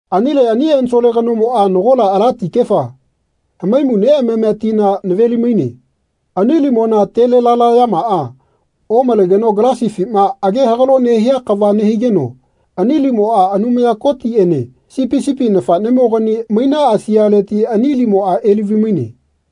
Anile ani ensole kanomoꞌa nagola ala tikefa, hamaimu neꞌamamia tina naveli-maine. Ani limona telelalayamaꞌa omalegeno galasifima age-hagalo nehia kava nehigeno ani limoꞌa Anumaya Kotiꞌene Sipi sipi nafaꞌnemogani mainaꞌa sialeti ani limoꞌa elavi-maine.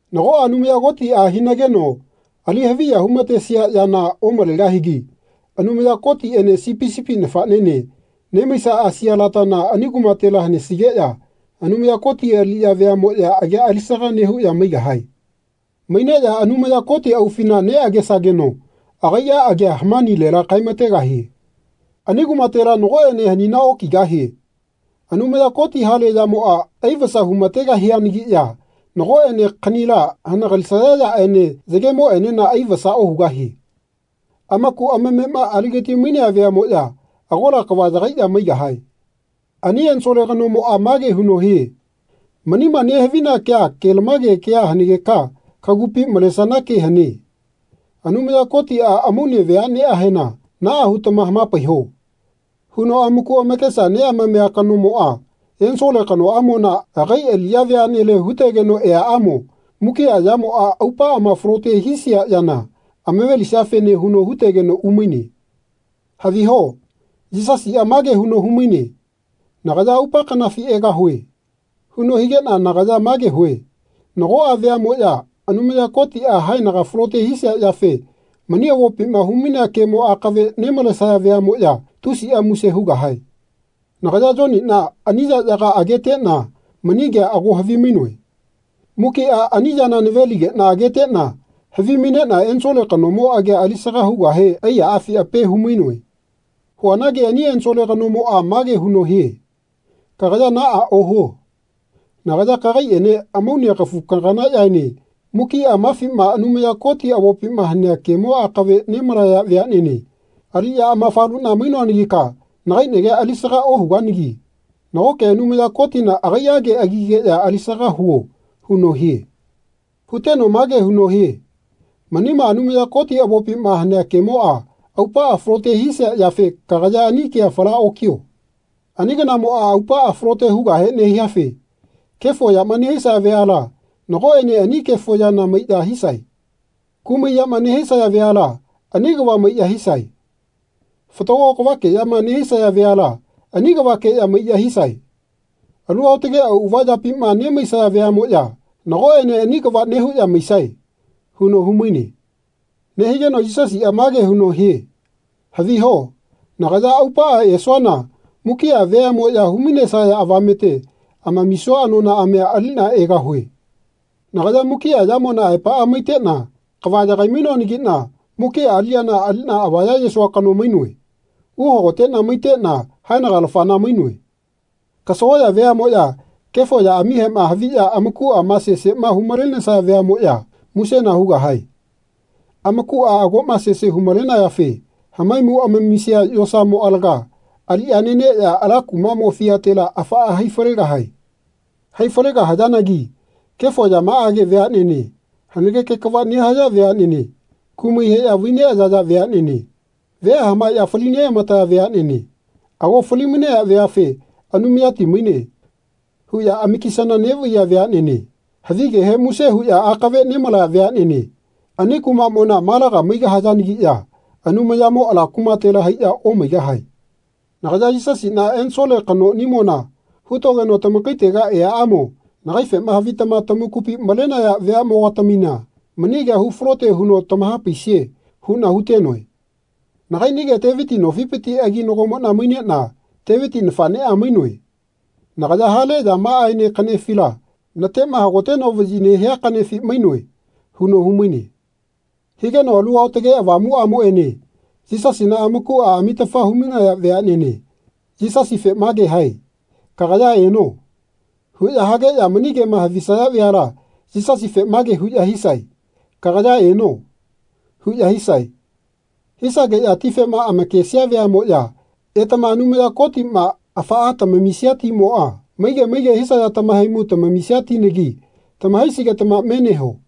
Nagoꞌa Anumaya Kotiꞌa hinageno ali haviya humatesia yana omalegahigi Anumaya Kotiꞌene Sipi sipi nafaꞌnene nemaiꞌa sialatana ani kumatela hanesigeꞌya Anumaya Koti aliꞌya veaꞌmoꞌya agia alisaga nehuꞌya maigahae. Maineꞌya Anumaya Koti aufina neꞌagesageno agaiꞌa agia hamanilela kaemategahie. Ani kumatela nagoꞌene hanina okigahie. Anumaya Koti hale yamoꞌa aivasa humategahianagiꞌya nagoꞌene kaꞌnila hanagalisaya yaꞌene yagemoꞌenena aivasa ohugahie. Amaku amamema agigati-mainea veaꞌmoꞌya agola kava yagaiꞌya maigahae. Ani ensole kanomoꞌa mage huno hie “Manima nehavina kea kelamage kea hanegeka kagupi malesana ke hane. Anumaya Kotiꞌa amaune veaꞌneꞌahena ‘Naꞌa hutama hamapaiho.’ huno amaku amakesa neꞌamamia kanomoꞌa ensole kanoꞌamona agai aliꞌya veaꞌnele hutegeno eaꞌamo mukiꞌa yamoꞌa aupaꞌama falote hisia yana amave-lisiafene huno hutegeno umaine.” Haviho. Yisasiꞌa mage huno humaine “Nagaya aupa kanafi egahue.” huno higeꞌna nagaya mage hue “Nagoꞌa veaꞌmoꞌya Anumaya Kotiꞌa haenaga falote hisia yafe mani avopima hu-mainea kemo akave nemalesaya veaꞌmoꞌya tusiꞌa muse hugahae.” Nagaya Yoniꞌna ani yaꞌyaga ageteꞌna mani kea ago havimainoe. Mukiꞌa ani yana nave-ligeꞌna ageteꞌna havimaineꞌna ensole kanomo agia alisaga hugahe aiyaꞌafi ape humainoe. Huanagi ani ensole kanomoꞌa mage huno hie “Kagaya naꞌa ohuo. Nagaya kagaiꞌene amaune kafu-kaganaꞌyaene mukiꞌa mafima Anumaya Koti avopima hanea kemo akave nemalaya veaꞌnene aliꞌya amafaluꞌna mainoanagika nagai nagia alisaga ohuganagi nagoke Anumaya Kotina agaiꞌage agigeꞌya alisaga huo huno hie.” Huteno mage huno hie “Manima Anumaya Koti avopima hanea kemoꞌa aupaꞌa falote hisia yafe kagaya ani kea fala okio. Ani kanamoꞌa aupaꞌa falote hugahe nehiafe kefo yama nehisaya veala nagoꞌene ani kefo yana maiꞌya hisae. Kumai yama nehisaya veala ani kava maiꞌya hisae. Fatago kavakeꞌyama nehisaya veala ani kavakeꞌya maiꞌya hisae. Alu aotage auꞌava yapima nemaisaya veaꞌmoꞌya nagoꞌene ani kava nehuꞌya maisae.” huno humaine. Nehigeno Yisasiꞌa mage huno hie “Haviho nagaya aupaꞌa esuana mukiꞌa veaꞌmoya hu-mainesaya avamete amamisua anonaꞌamia aliꞌna egahue. Nagaya mukiꞌa yamona aepaꞌa maiteꞌna kava yagai-mainoanagiꞌna mukiꞌa aliꞌyana aliꞌna avaya-yesua kano mainoe. Uhagoteꞌna maitena haenaga-lafana mainoe. Kasagoꞌya veaꞌmoꞌya kefo yaꞌamihema haviꞌya amakuꞌama seseꞌma humalenesaya veaꞌmoꞌya musena hugahae. Amakuꞌa agoꞌma sese hu-malenayafe hamaimu amamisia yosamo alaga aliꞌya neneꞌya ala kumaꞌmo fiatela afaꞌa hai falegahae. Hai falegahayanagi kefo yamaꞌage veaꞌnene, hanageke kava nehaya veaꞌnene, kumai heꞌya vaineꞌayaya veaꞌnene, vea hamaeꞌya falineꞌamataya veaꞌnene, ago fali-mainaya veafe ‘Anumayati maine.’ huꞌya amakisana neꞌvaiya veaꞌnene havigehe muse huꞌya akave nemalaya veaꞌnene ani kumaꞌmona malaga maigahayanagiꞌya Anumayamo ala kumatela haiꞌya omaigahae. Nagaya Yisasiꞌna ensole kanoꞌnimona hutogeno tamakaitega eaꞌamo nagaifema havitama tamakupi malenaya veaꞌmo-gatamina mani kea hufalote huno tamahapaisie huꞌna hutenoe. Nagaiꞌnige Teviti nofipiti aginagomoꞌna maineꞌna Teviti nafaꞌneꞌa mainoe. Nagaya hale yamaꞌaene kaꞌnefila, natema hagoteno vaꞌyi nehia kaꞌnefi mainoe.” huno humaine. Higeno Alu Aotage Avamuꞌamoꞌene Yisasina amakuꞌa amitafa humainaya veaꞌnene Yisasife mage hae “Kagaya eno.” huꞌya hageꞌya mani kema havisaya veala Yisasife mage huꞌya hisae “Kagaya eno.” huꞌya hisae. Hisageꞌya tifema amakesia veaꞌmoꞌya etama Anumaya Kotiꞌma afaꞌa tamamisia timoꞌa maige maige hisaya tamahaimu tamamisia tinagi tamahaisigetama me neho.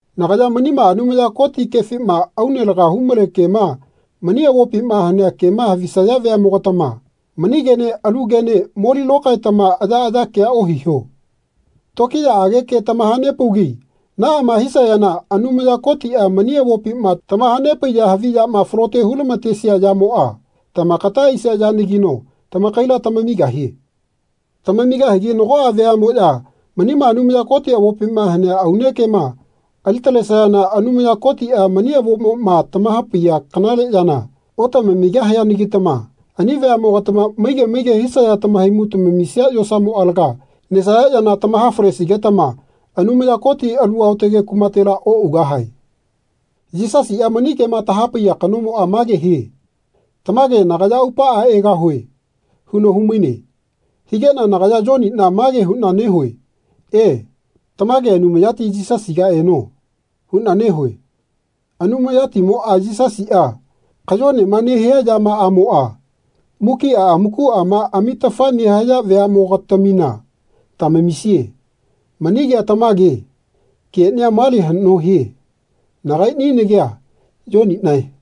Nagaya manima Anumaya Koti kefima aune laga humale kema mani avopima hanea kema havisaya veaꞌmogatama mani kene alu kene moli lokaetama ayaꞌaya kea ohiho. Tokiyaꞌage ke tamahanepaugi naꞌama hisayana Anumaya Kotiꞌa mani avopima tamahanepaiya havi yama falote hulamatesia yamoꞌa tamakata aisia yanagino tamakaila tamamigahie. Tamamigahigi nagoꞌa veaꞌmoꞌya manima Anumaya Koti avopima hanea aune kema ali talesayana Anumaya Kotiꞌa mani avomoꞌma tamahapaiya kanale yana otamamigahianagitama ani veaꞌmogatama maige maige hisaya tamahaimu tamamisia yosamo alaga nesaya yana tamaha-falesigetama Anumaya Koti alu aotage kumatela oꞌugahae. Yisasiꞌa mani kema tahapaiya kanomoꞌa mage hie “Tamage nagaya aupaꞌa egahue.” huno humaine. Higeꞌna nagaya Yoniꞌna mage huꞌna nehue “E, tamage Anumayati Yisasiga eno.” huꞌna nehue. Anumayatimoꞌa Yisasiꞌa kayonema nehia yamaꞌamoꞌa mukiꞌa amakuꞌama amitafa nehaya veaꞌmo-gatamina tamamisie. Mani kea tamage. Keꞌnia male haꞌno hie. Nagaiꞌni nagia Yoniꞌnae.